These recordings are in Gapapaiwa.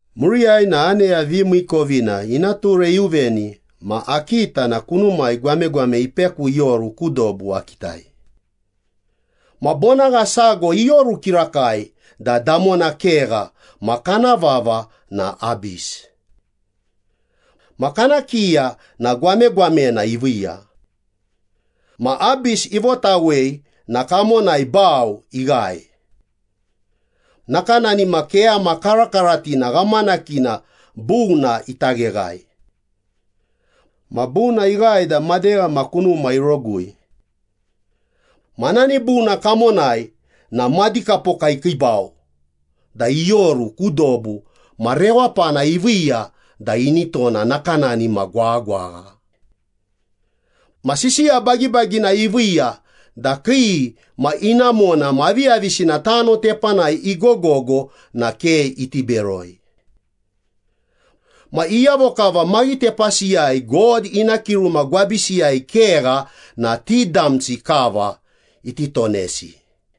Muriyai na aneya vimiikovina ina ture iuveni ma akita na kunumai gwamegwame ipeku ioru ku dobu akitai. Ma bonagha sago ioru kirakai da damona kegha ma kana vava na Abis. Ma kana kiya na gwamegwamena iviiya. Ma Abis ivotawei na kamonai bau ighae, nakanani ma keyama karakaratina ghamanakina buna ita gheghae. Ma buna ighae da madegha ma kunuma irogui. Ma nani buna kamonai na madikapoka ikiibau da ioru ku dobu ma rewapana iviiya da ini tona nakanani ma gwaghagwagha. Ma sisiya bagibagina iviiya da kii ma inamona ma aviyavisina tano tepanai igogogo na ke iti beroi. Ma iyavo kava maghitepasiyai God ina kiruma gwabisiyai kegha na ti damsi kava iti tonesi.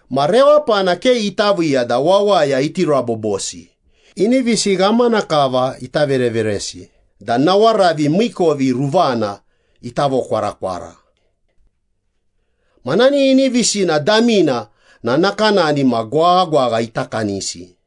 Ma rewapana ke ita viiya da wawaya iti rabobosi, inivisi ghamana kava ita vereveresi da nawaravi miikovi ruvana ita vokwarakwara. Ma nani inivisina damina na nakanani ma gwaghagwagha ita kanisi.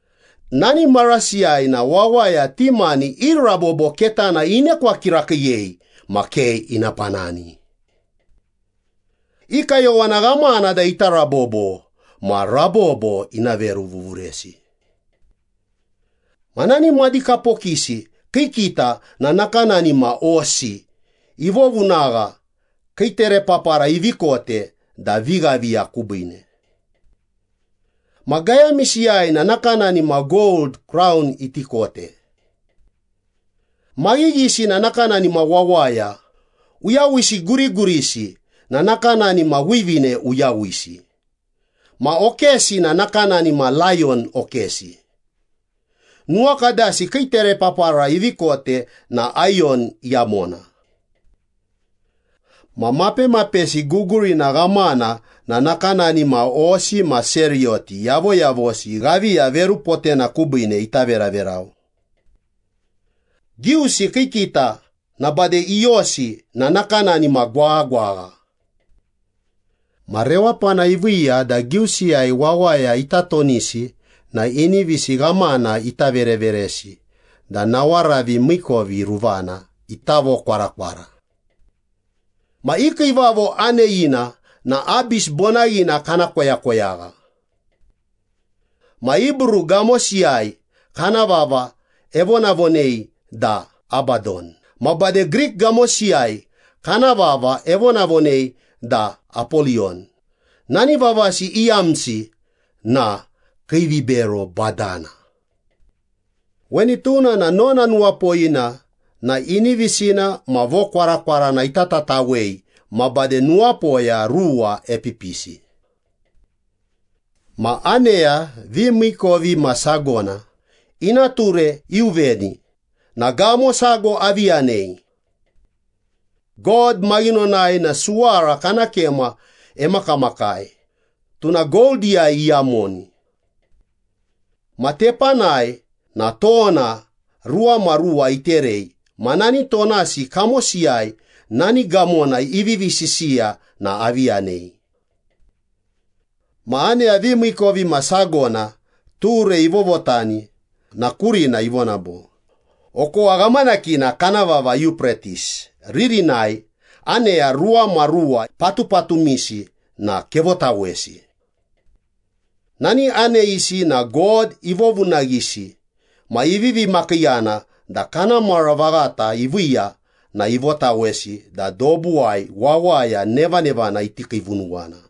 Nani marasiyai na wawaya ti mani i rabobo ketana inekwa kirakiiyei ma ke ina panani. I kayowana ghamana da ita rabobo, ma rabobo ina veruvuvuresi. Ma nani madikapokisi kii kita na nakanani ma hosi ivovunagha, kii terepapara ivi kote da vighaviya kubiine. Ma gayamisiyai na nakanani ma gold kraun iti kote. Maghighisi na nakanani ma wawaya, uyawisi gurigurisi na nakanani ma wivine uyawisi, ma okesi na nakanani ma layon okesi. Nuwakadasi kii terepapara ivi kote na ayon iyamona. Ma mapemapesi gugurina ghamana na nakanani ma hosi ma seriyoti yavoyavosi ghaviya verupotena kubiine ita veraverau. Giusi kii kita ma bade iyosi na nakanani ma gwaghagwagha. Ma rewapana iviiya da giusiyai wawaya ita tonisi na inivisi ghamana ita vereveresi da nawaravi miikovi ruvana ita vokwarakwara. Ma i kiivavo aneyina na Abis bonaghina kana koyakoyagha. Ma Hibru gamosiyai kana vava evonavonei da Abadon ma bade Grik gamosiyai kana vava evonavonei da Apoliyon, nani vavasi iyamna na Kiivibero Badana. Weni tuna na nona nuwapoyina na inivisina ma vokwarakwarana itatawei ma bade nuwapoya ruwa epipisi. Ma aneya vimiikovimasagona ina ture iuveni na gamo sago avi yanei. God maghinonai na suwara kana kema emakamakai, tuna goldiyai iyamoni. Ma tepanai na tona ruwamaruwa iterei ma nani tonasi kamosiyai nani gamona ivivi sisiya na avi yanei. Ma aneya vimiikovimasagona ture ivovotani na kurina ivona bo, “Okowa ghamanakina kana vava Yupretis ririnai aneya ruwamaruwa patupatumisi na kevotawesi.” Nani aneyisi na God ivovunaghisi ma ivivi makiiyana da kana mara vaghata iviiya na ivotawesi da dobuwai wawaya nevanevana iti kiivunuwana.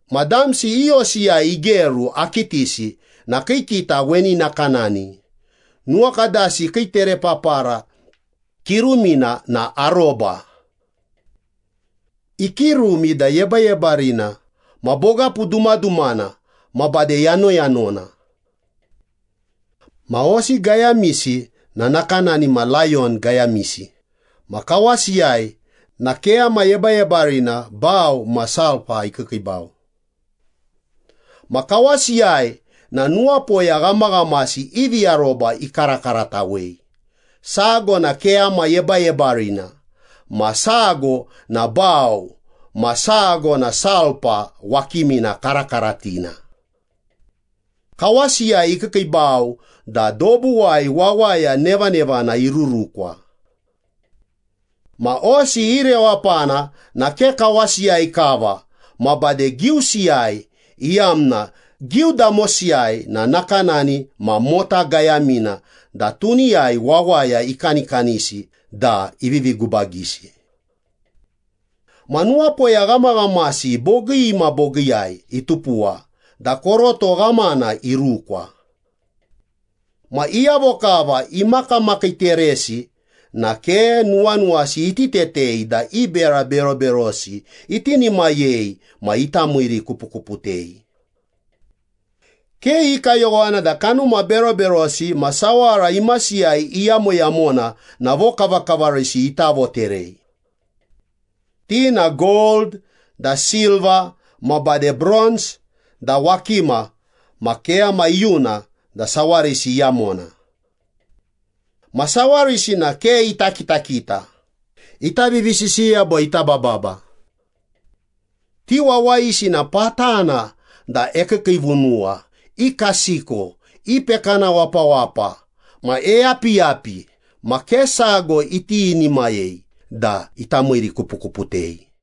Ma damsi i hosiyai igeru akitisi na kii kita weni nakanani. Nuwakadasi kii terepapara kirumina na aroba. Ikirumi da yebayebarina ma bogapu dumadumana ma bade yanoyanona. Ma hosi gayamisi na nakanani ma layon gayamisi ma kawasiyai na keyama yebayebarina, bau ma sulpa ikiikiibau. Ma kawasiyai na nuwapoya ghamaghamasi ivi aroba ikarakaratawei, sago na keyama yebayebarina ma sago na bau ma sago na sulpa wakimina karakaratina. Kawasiyai ikiikiibau da dobuwai wawaya nevanevana irurukwa. Ma hosi i rewapana na ke kawasiyai kava ma bade giusiyai, iyamna giudamosi na nakanani ma mota gayamina da tuniyai wawaya ikanikanisi da ivivi gubagisi. Ma nuwapoya ghamaghamasi bogii ma bogiiyai itupuwa da koroto ghamana irukwa. Ma iyavo kava imakamakiiteresi na ke nuwanuwasi iti tetei da i bera beroberosi itinimayei ma ita miirikupukuputei. Ke i kayowana da kanuma beroberosi ma sawara imasiyai iyamoyamona na vokavakavarisi ita voterei. Ti na gold da silva ma bade bronz da wakima ma keyama iyuna da sawarisi iyamona. Ma sawarisi na ke ita kitakita, ita vivisisiya bo ita bababa. Ti wawayisi na patana da ekiikiivunuwa, ikasiko, ipekana wapawapa ma eyapiyapi ma ke sago itinimayei da ita miirikupukuputei.